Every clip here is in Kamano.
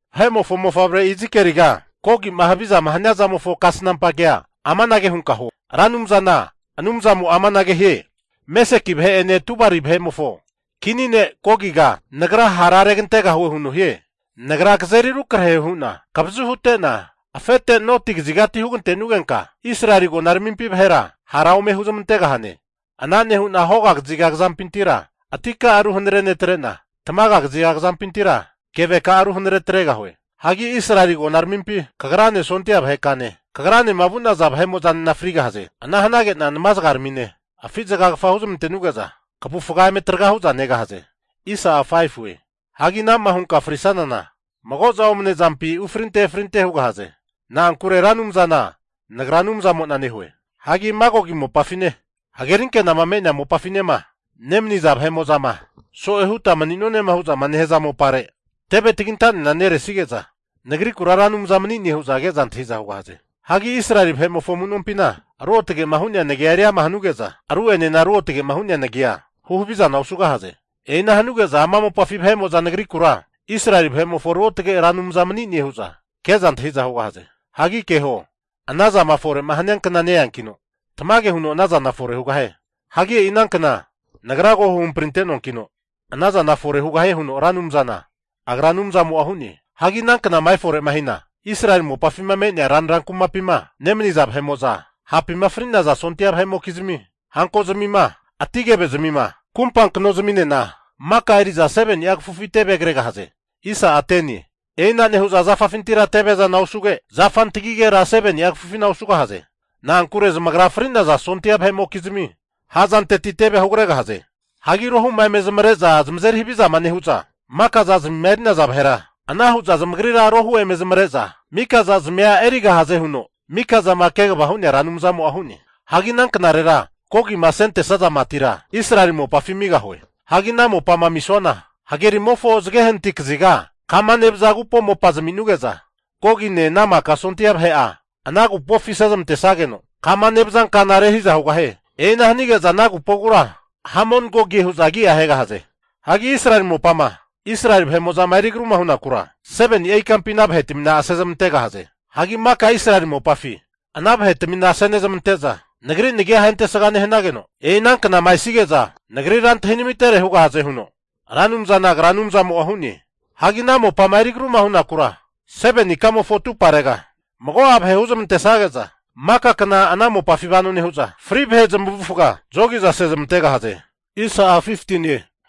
Vahe'mofo mofavre Izikieliga, Gogi'ma havizama hania zamofo kasnampa kea amanage hunka huo, Ra Anumzana Anumzamo'a amanage hie. Meseki vahe'ene Tubali vahe'mofo kini ne' Gogiga Nagra hara regantegahue huno hie. Nagra kazeri rukrahe hu'na kavazu hute'na afete noti kazigati hugantenugenka Israeli agonaramimpi vahera hara ome huzmantegahane. Ana nehu'na hoga kaziga kazampintira atika'a ruhanare netrena, tamaga kaziga kazampintira keveka'a ruhanare atregahue. Hagi Israeli agonaramimpi kagrane sondia vaheka'ane, kagranema vu'naza vahe'mo'zanena frigahaze. Ana hanage'na namazagaramine afi zagagafa huzmantenuge'za kavufga eme traga hu'za negahaze. Hagi ana'ma hunka frisanana mago'za omane zampi ufrinte efrinte hugahaze. Na'ankure Ra Anumzana Nagra Anumzamo'na hue. Hagi Magogi mopafine, hagerinkenama me'nea mopafinema nemaniza vahe'mo'zama so'e huta mani'nonema hu'za nehaza mopare teve tagintanena neresige'za Nagrikura Ra Anumza mani'ne hu'za ke'za antahiza hugahaze. Hagi Israeli vahe'nimofo amunompina ruotgema hu'nea Nagia eriama hanuge'za, ru'enena ruotge'ma hu'nea nagia huhavizana osugahaze. E'ina hanuge'za ama mopafi vahe'mo'za Nagrikura Israeli vahe'mofo Ruotge Ra Anumza mani'ne hu'za ke'za antahi'za hugahaze. Hagi keho, ana zama fore'ma hania kna neiankino tamage huno ana zana fore hugahie. Hagi e'i ana kna Nagra ko huhampri ante'noankino, anazana fore hugahie huno Ra Anumzana Agra Anumzamo'a hu'ne. Hagi ana knama efore hina, Israeli mopafima me'nea ranra kumapima nemaniza vahe'mo'za, hapima fri'naza sondia vahe'mokizmi hanko'zmima, ati kevezmima, kumpa knozminena maka eri'za 7ni'a kafufi tevea kregahaze. E'ina nehu'za zafafintira teve'zana osuge, zafa antagigera 7ni'a kafufina osugahaze. Na'ankure zamagra fri'naza sondia vahe'mokizmi ha'zanteti tevea hugregahaze. Hagi rohu'ma eme zamare'za zamazeri havizama nehu'za mika zazimima eri'naza vahera, ana hu'za zamagrira arohu ome zamare'za mika zazmia erigahaze huno Mikazama kegavama hu'nea Ra Anumzamo'a hu'ne. Hagi ana knarera Gogima asentesaza matira Israeli mopafi amigahue. Hagi ana mopama amisuana, fri hagerimofo zage hanati kaziga kama nevaza agupo mopa zami'nuge'za, Gogine ana maka sondia vahe'a ana agupofi asezmantesageno, kama nevaza kana rehiza hugahie. E'ina hanige'za ana agupogura Hamon-gogie hu'za agia ahegahaze. Hagi Israeli mopama Israeli vahe'mo'zama eri agruma hunakura, 7ni'a ikampi ana vahetamina asezmantegahaze. Hagi maka Israeli mopafi ana vahetamina asenezmante'za Nagri nagia ahentesga nehanageno, e'i ana knama esige'za Nagrira antahinamitere hugahaze huno Ra Anumzana Agra Anumzamo'a hu'ne. Hagi ana mopama eri agruma hunakura 7ni ikamofo atumparega mago'a vahe huzmantesage'za maka kna ana mopafina vano nehu'za, fri vahe zamavufaga zogi'za asezmantegahaze.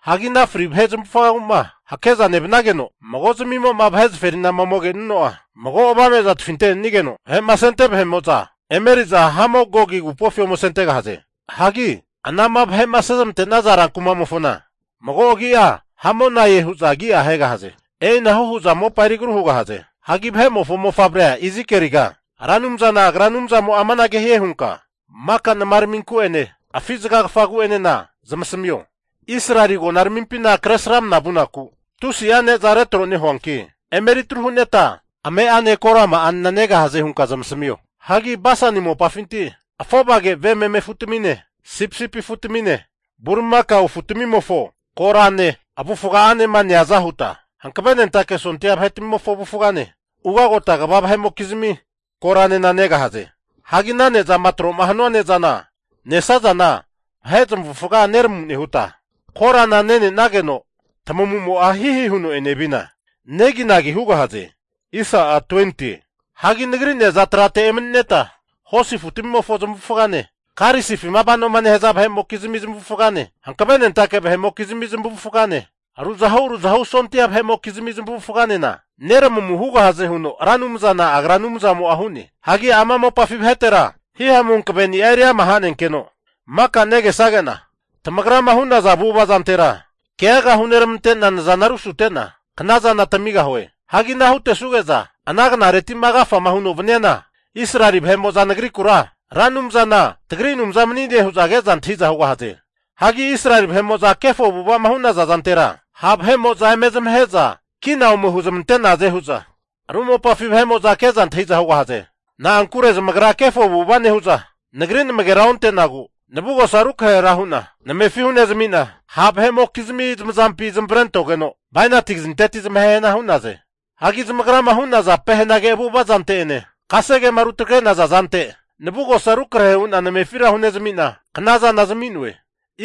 Hagi ana fri vahe zamavufagagu'ma hakeza nevanage'no mago zamimo'ma vahe zaferinama ome kenuno'a, mago avame'za tafintenenigeno vahe'ma asente vahe'mo'za emeriza Hamon-Gogi Agupofi ome asentegahaze. Hagi anama vahe'ma asezmante'naza rankumamofona mago agi'a Hamonae hu'za agi'a ahegahaze. E'inahu hu'za mopa eri agru hugahaze. Hagi vahe'mofo mofavrea Izikieliga, Ra Anumzana Agra Anumzamo'a amanage hie hunka maka namaramimku'ene afi zagagafagu'enena zamasamio, Israeli agonaramimpina Kresramana vunaku tusi'a ne'za retro nehuanki, emeri atru huneta ame'ane korama'anena negahaze hunka zamasamio. Hagi Basani mopafinti afovage ve meme afutamine, sipisipi afu'tamine bulimakao afutamimofo korane avufga'anema neaza huta, hankavenentake sondia vahe'mokizmi zamavufagane, ugagota kva vahe'mokizmi koranena negahaze. Hagi ana ne'zama retro'ma hanua ne'zama nesazana vahe zamavufaga neramu nehuta, korana nene'nageno tamu'mo'a hihi huno enevina neginagi hugahaze. Hagi Nagri ne'za trate emanineta, hosi afutamimofo zamavufagane, karisifima vanoma nehaza vahe'mokizmi zamavufagane, hankavenentake vahe'mokizmi zamavufagane, ruzahu ruzahu sondia vahe'mokizmi zamavufaganena neramamu hugahaze huno Ra Anumzana Agra Anumzamo'a hu'ne. Hagi ama mopafi vahetera hihamu hankaveni'a eriama hanenkeno, maka negesage'na, tamagrama hu'naza avu'ava zantera keaga huneramante'na nazana rusutena knazana tamigahue. Hagi ana hutesuge'za ana knareti'ma agafama huno vaniana, Israeli vahe'mo'za Nagrikura Ra Anumzana tagri Anumza mani'ne hu'za ke'za antahi'za hugahaze. Hagi Israeli vahe'mo'za kefo avu'ava'ma hu'naza zante ha' vahe'mo'za eme zamahe'za kina ome huzmante'naze hu'za, ru mopafi vahe'mo'za ke'za antahi'za hugahaze. Na'ankure zamagra kefo avu'ava nehu'za, Nagri namagera onte'nagu navugosa ru krahe hu'na namefi hunezmi'na ha' vahe'mokizmi zamazampi zamavarentogeno, bainati kazinteti zamahehana hu'naze. Hagi zamagrama hu'naza pehenage avu'ava zante'ene kasegema rutagre'naza zante navugosa rukrahe hu'na namefira hunezmi'na, knazana zami'noe.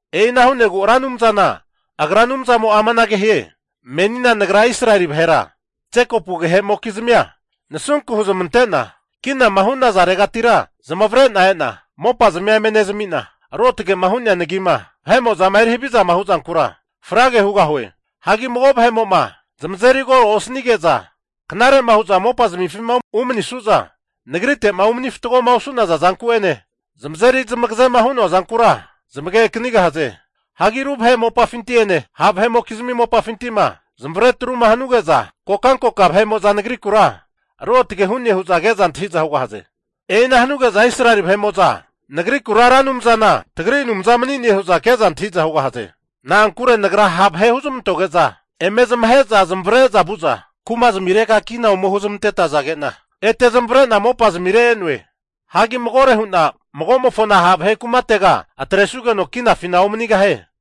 E'ina hu'negu Ra Anumzana Agra Anumzamo'a amanage hie, menina Nagra Israeli vahera Jekopu agehe'mokizmia nasunku huzmante'na kinama hunazaregatira zamavare'na e'na mopazmia eme nezmi'na, Ruotge'ma hu'nea nagima vahe'mo'zama eri havizama hu'zankura frage hugahue. Hagi mago vahe'mo'ma zamazeri koro osanige'za knare'ma hu'za mopazmifima umanisu'za, Nagrite'ma mani fatgoma osu'naza zanku'ene zamazeri zamagaze'ma hu'noa zankura zamage akanigahaze. Hagi ru vahe mopafinti'ene ha' vahe'mokizmi mopafinti'ma zamavare atruma hanuge'za, kokankoka vahe'mo'za nagrikura Ruotge hune hu'za ke'za antahiza hugahaze. E'ina hanuge'za Israeli vahe'mo'za Nagrikura Ra Anumzana tagri Anumza mani'ne hu'za ke'za antahiza hugahaze. Na'ankure Nagra ha' vahe huzmantoge'za eme zamahe'za zamavare'za vu'za kumazmirega kina ome huzmantetazage'na ete zamavare'na mopazmire e'noe. Hagi magore hu'na magomofona ha' vahe kumatega atresugeno kinafina omanigahie.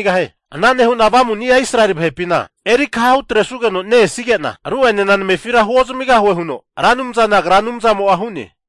Ana nehu'na Avamuni'a Israeli vahepina eri akaha hutresugeno ne-esige'na, ru'enena namefira huo zamigahue huno Ra Anumzana Agra Anumzamo'a hu'ne.